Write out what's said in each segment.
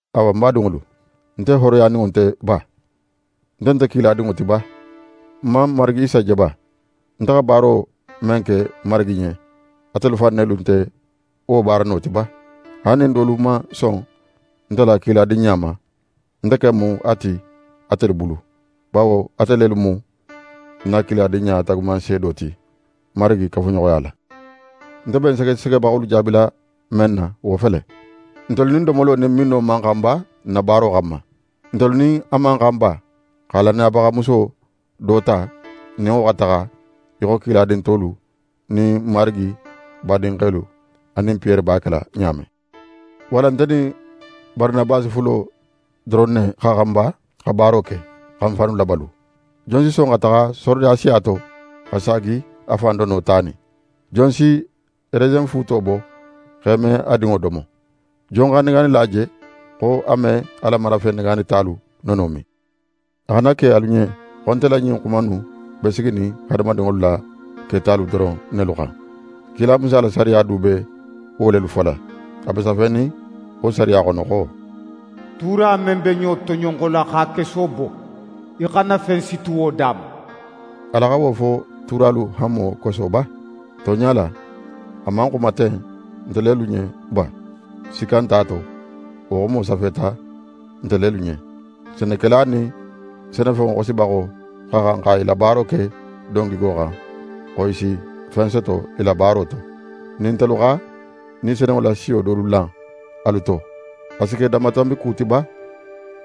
Awa, ń badinŋolu, nte hooroyaninŋo nte ba? Nte nte kiladinŋo ti ba? Ń man n Marigi Isa je ba? Nte xa baaro men ke Marigi ɲen, atelu fan nelu nte wo baarano ti ba? Haali nin dolu man son nte la kiladinɲa ma, ń ken mu a ti atelu bulu; bawo ate lelu mu ń na kiladinɲa taagumanseedo ti, Marigi kafuɲoxoya la. Nte be ń segesegebaxolu jaabila men na wo fele: Ntelu nin domolo nin minno man xan ba, n na baaro xanma? Ntelu nin a man xan ba xa lannayabaxa muso do ta, n nin wo xa taxa í xo kiladin tolu nin Marigi badinxelu anin Piyere b'a kela ɲa men? Walla nte nin Baranabasi fulo doron ne xa xan ba xa baaro ke, xa n fannu labalu? Jon si son xa taxa sorodasiya to, xa saagi a fan dono tanin? Jon si resenfuuto bo x'é me a dinŋo domo? Jon xa negaanila je xo a me a la marafen negaanitalu nono min? A xana ke alu ɲen xo nte la ɲin xuma innu be siginin hadamadinŋolu la ketalu doron nelu xan. Kila Musa la sariya du be wo lelu fola. A be safenin wo sariya xono xo: “Tuura men be ɲo toɲonxola x'a keso bo, í xana fen siti wo da ma.” Ala xa wo fo tuuralu hanmo koso ba? Tonɲa la, a man xuma ten nte lelu ɲen ba? Sikka nte a to, wo xumo safeta nte lelu ɲen. Senekela nin senefenŋo xosibaxo xa xan xa i la baaro ke don gigo xan, xo i si fen soto i la baaro to. Nin ntelu xa Ni Senunŋo la siyo dolu lan alu to: A si ke danmatanbi ku ti ba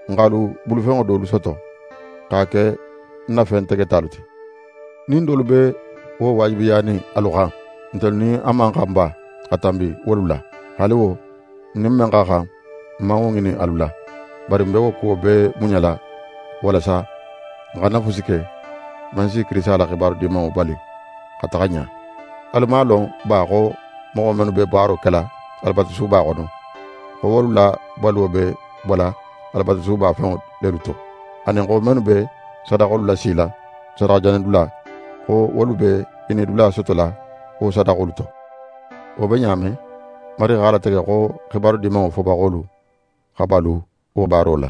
n x'alu bulufenŋo dolu soto, x'a ke n na fen tegetalu ti? Nin dolu be wo waajibiyanin alu xan, ntelu nin a man xan ba xa tanbi wolu la? Haali wo, n nin men xa xan, n man wo ŋinin alu la. Bari n be kuwo bee muɲala walasa n xana fusi ke, men si Kirisita la xibaru Dimanŋo bali xa taxa ɲa. Alu man a lon ba xo moxo mennu be baaro kela Alabatusuba xono, xo wolu la baluwo be bola Alabatusuba fenŋo lelu to, anin xo mennu be sadaxolu lasila sadaxajanidula, xo wolu be i nidula sotola wo sadaxolu to? Wo be ɲa men, Marigi x'a latege xo Xibaru Dimanŋo fobaxolu xa balu wo baaro la.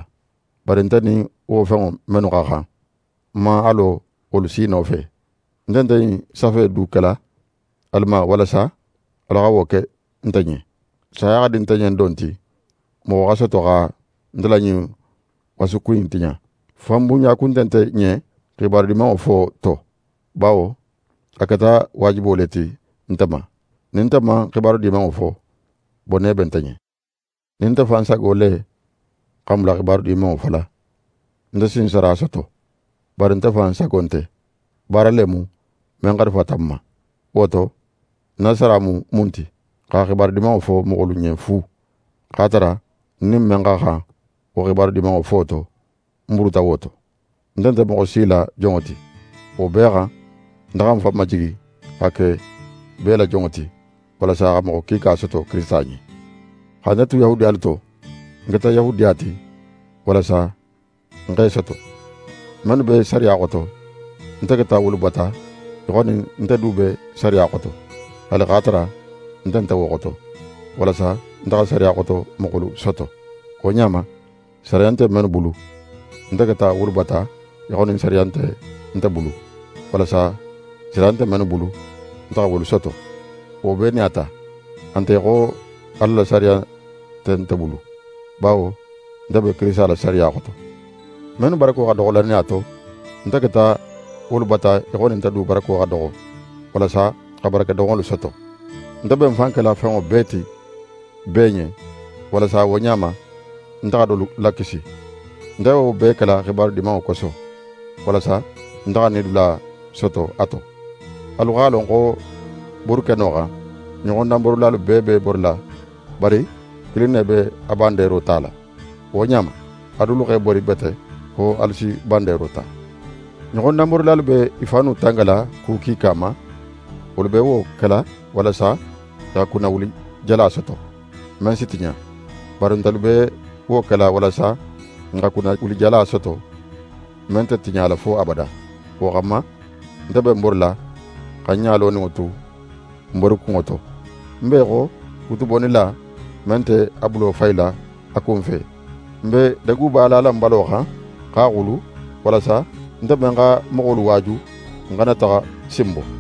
Bari nte nin wo fenŋo mennu xa xan, ń man a lo wolu si nofe. Nte nte ɲin safe in du kila alu ma walasa alu xa wo ke nte ɲen. Saya xa di nte ɲen don ti moxo xa soto xa nte la ɲin wasuku in tiɲa. Fanbunɲa kun nte nte ɲen Xibaru Dimanŋo fo to; bawo a keta waajibo le ti nte ma. Nin nte man Xibaru Dimanŋo fo, bone be nte ɲen. Nin nte fan sago le xa ń bula Xibaru Dimanŋo fola, nte si ń sara soto. Bari nte fan sago nte, baara le mu, men xarifata ń ma. Wo to, ń na sara mu mun ti? Xa Xibaru Dimanŋo fo moxolu ɲen fu, x'a tara ń nin men xa xan wo Xibaru Dimanŋo fo to, ń buruta wo to. Nte nte moxo si la jonŋo ti. Wo bee xan, nte xa ń fan majigi xa ke bee la jonŋo ti, walasa xa moxo kiika soto Kirisita ɲen. Xa nte tu Yahudiyalu to, ń keta Yahudiya ti, walasa ń x'e soto. Mennu be sariya xoto, nte keta wolu bata í xo nin nte du be sariya xoto, haali x'a tara nte nte wo xoto, walasa nte xa sariya xoto moxolu soto. Wo ɲa ma, sariya nte mennu bulu, nte keta wolu bata í xo nin sariya nte nte bulu; walasa sariya nte mennu bulu, nte xa wolu soto. Wo bee nin a ta, a nte í xo nin Ala la sariya nte nte bulu; bawo nte be Kirisita la sariya xoto. Mennu barako xa doxo lannaya to, nte keta wolu bata í xo nin nte du barako xa doxo; walasa xa barakedoxonŋolu soto. Nte be ń fan kela fenŋo bee ti bee ɲen; walasa ɲa wo ɲa ma, nte xa i dolu lakisi. Nte be wo bee kela Xibaru Dimanŋo koso; walasa nte xa ń nidula soto a to. Alu x'a lon xo borikeno xan, ɲoxodanborilalu bee b'e borila; bari kilin ne be a bandeero tala. Wo ɲa ma, alu dulu x'e bori bete fo alu si bandeero ta. Ɲoxodanborilalu be i fannu tangala ku kiika ma. Wolu be wo kela walasa i xa kunnawulijala soto, men si tiɲa. Bari ntelu be wo kela walasa n xa kunnawulijala soto, men nte tiɲala fo abada. Wo xanma, nte be ń borila, xa ń ɲa loninŋo tu ń borikunŋo to. Ń be í xo kutubonnila, men nte a bulo fayila a kunfe. Ń be deguba lala ń balo xan, x'a xulu; walasa nte men xa moxolu waaju, ń xana taxa sinbo.